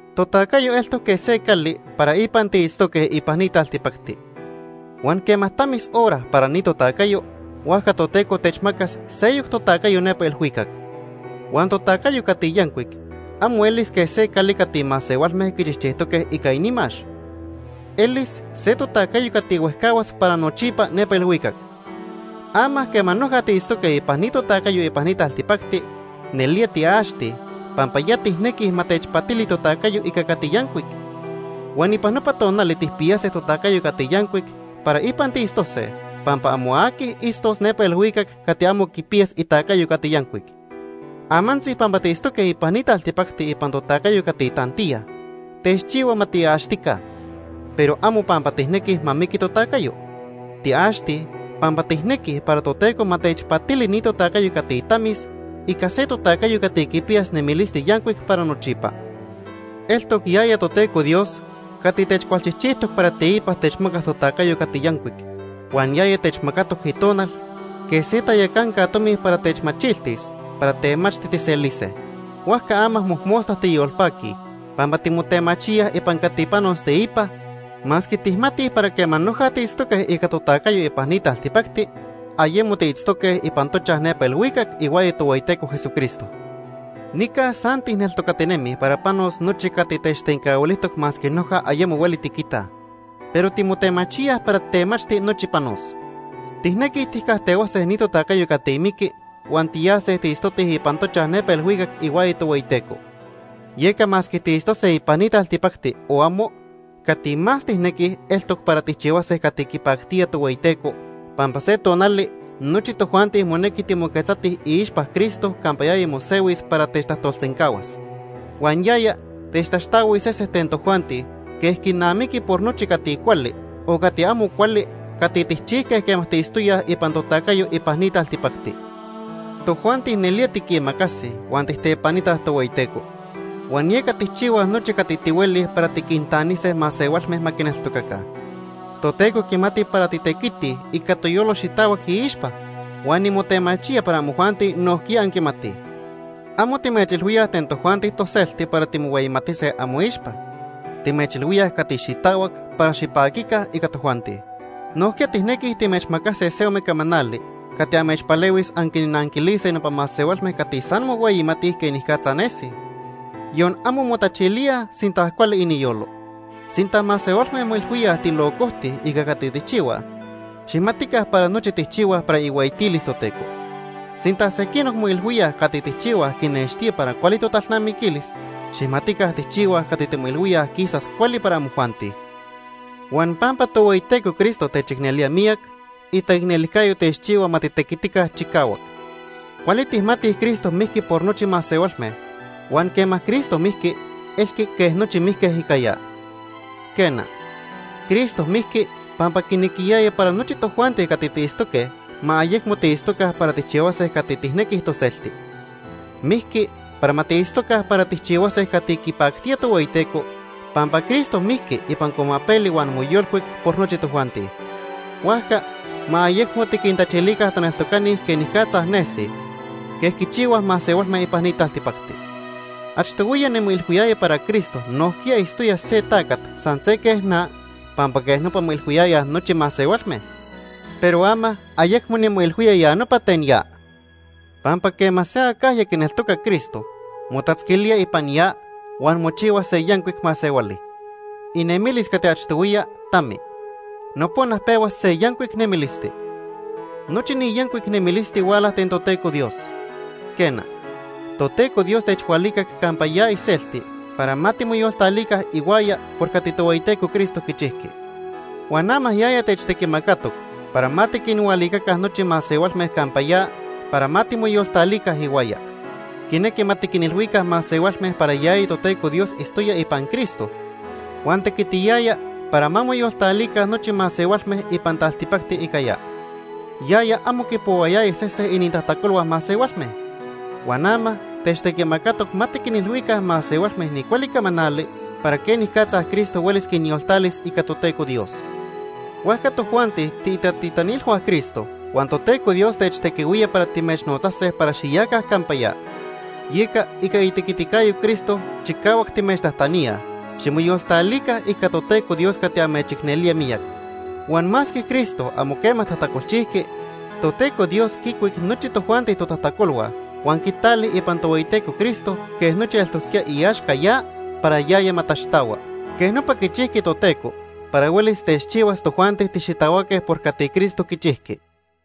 Totacayo eltoc quej se cali para ipan tiitztoque ipan ni taltipacti. Huan quema tamis hora para ni totacayo, huajca Toteco techmacas seyoc totacayo nepa ilhuicac. Huan totacayo cati yancuic amo elis quej se cali cati masehualme quichijchijtoque ica inimax. Elis se totacayo cati huejcahuas para nochipa nepa ilhuicac. Ama quema noja tiitztoque ipan ni totacayo ipan ni taltipacti, nelía tiaxtij pampa ya tijnequij ma techpatili totacayo ica cati yancuic. Huan ipan nopa tonali tijpiyase totacayo cati yancuic para ipan tiitztose, pampa amo aqui itztos nepa ilhuicac cati amo quipiyas itacayo cati yancuic. Amantzi pampa tiitztoque ipan ni taltipacti ipan totacayo cati tantiya, techchihua ma tiaxtica, pero amo pampa tijnequij ma miqui totacayo. Tiaxtij pampa tijnequij para Toteco ma techpatili ni totacayo cati tamis ica se totacayo cati quipiyas nemilisti yancuic para nochipa. Eltoc yaya Toteco Dios cati techcualchijchijtoc para teipa techmacas totacayo cati yancuic, huan yaya techmacatoc Itonal quej se tayacanca tomi para techmachiltis para temachti tijselise. Huajca ama mojmosta tiyolpaquij pampa timotemachíaj ipan cati panos teipa, masque tijmatij para quema noja tiitztoque ica totacayo ipan ni taltipacti, ayemo tiitztoque ipan tochaj nepa ilhuicac ihuaya Tohueyiteco Jesucristo. Nica san tijneltocatinemij para panos nochi cati techtencahuilijtoc masque noja ayemo hueli tiquitaj. Pero timotemachíaj para temachti nochi panos. Tijnequij tijcajtehuase ni totacayo cati miqui huan tiyase tiitztotij ipan tochaj nepa ilhuicac ihuaya Tohueyiteco. Yeca masque tiitztose ipan ni taltipacti o amo, cati más tijnequij eltoc para tijchihuase cati quipactía Tohueyiteco, pampa se tonali nochi tojuanti monequi timoquetzatij iixpa Cristo campa yaya mosehuis para techtajtolsencahuas. Huan yaya techtaxtahuis sesen ten tojuanti quej quinamiqui por nochi cati cuali o cati amo cuali cati tijchijque quema tiitztoyaj ipan totacayo ipan ni taltipacti. Tojuanti nelía tiquimacasij huan tijtepanitaj Tohueyiteco, huan yeca tijchihuaj nochi cati tihuelij para tiquintanise masehualme ma quineltocaca. Toteco quimati para titequitij ica toyolo xitahuac iixpa, huan nimotemachía para amojuanti nojquiya anquimatij. Amo sempa timechilhuíaj ten tojuanti toselti para timohueyimatise amoixpa, timechilhuíaj cati xitahuac para xipaquica ica tojuanti. Nojquiya tijnequij timechmacase se ome camanali cati amechpalehuis anquinnanquilise nopa masehualme cati san mohueyimatij quenicatza nesij, yon amo motachilíaj sinta cuali iniyolo. Sinta masehualme moilhuíaj tilocojtij ica cati tijchihuaj, xijmatica para nochi tijchihuaj para ihueyitilis Toteco. Sinta sequinoc moilhuíaj cati tijchihuaj quinextía para cuali totalnamiquilis, xijmatica tijchihuaj cati timoilhuíaj quisas cuali para amojuanti. Huan pampa Tohueyiteco Cristo techicnelía miyac, itaicnelijcayo techchihua ma titequitica chicahuac. Cuali tijmatij Cristo mijqui por nochi masehualme, huan quema Cristo mijqui, elqui quej nochi mijque ica ya. Quena, Cristo mijqui pampa quinequiyaya para nochi tojuanti cati tiitztoque ma ayecmo tiitztoca para tijchihuase cati tijnequij toselti. Mijqui para ma tiitztoca para tijchihuase cati quipactía Tohueyiteco pampa Cristo mijqui ipan cuamapeli huan moyolcuic por nochi tojuanti. Huajca ma ayecmo tiquintachilica taneltocani quenicatza nesij, quej quichihuaj masehualme ipan ni taltipacti. Achtohuiya nimoilhuiyaya para Cristo nojquiya itztoya se tacat san se quej na pampa quej nopa moilhuiyayaj nochi masehualme, pero ama ayecmo nimoilhuía ya nopa ten ya. Pampa quema se acajya quineltoca Cristo, motatzquilía ipan ya, huan mochihua se yancuic masehuali. Inemilis cati achtohuiya tami. Nopona pehua se yancuic nemilisti. Nochi ni yancuic nemilisti huala ten Toteco Dios. Quena, Toteco Dios techhualicac campa ya iselti para ma timoyoltalica ihuaya por cati Tohueyiteco Cristo quichijqui. Huan ama yaya techtequimacatoc para ma tiquinhualicaca nochi masehualme campa ya para ma timoyoltalica ihuaya. Quinequi ma tiquinilhuica masehualme para yaya Toteco Dios itztoya ipan Cristo huan tequitiyaya para ma moyoltalica nochi masehualme ipan taltipacti ica ya. Yaya amo quipohuayaya sese inintajtacolhua masehualme. Huan ama techtequimacatoc ma tiquinilhuica masehualme ni cuali camanali para quenicatza Cristo huelis quinyoltalis ica Toteco Dios. Huajca tojuanti tiitatitanilhua Cristo, huan Toteco Dios techtequihuía para timechnotzase para xiyaca campa ya. Yeca ica itequiticayo Cristo chicahuac timechtajtaníaj, ximoyoltalica ica Toteco Dios cati amechicnelía miyac. Huan masque Cristo amo quema tajtacolchijqui, Toteco Dios quicuic nochi tojuanti totajtacolhua huan quitali ipan Tohueyiteco Cristo quej nochi eltosquía iaxca ya para yaya ma taxtahua. Quej nopa quichijqui Toteco para huelis techchihuas tojuanti tixitahuaque por cati Cristo quichijqui.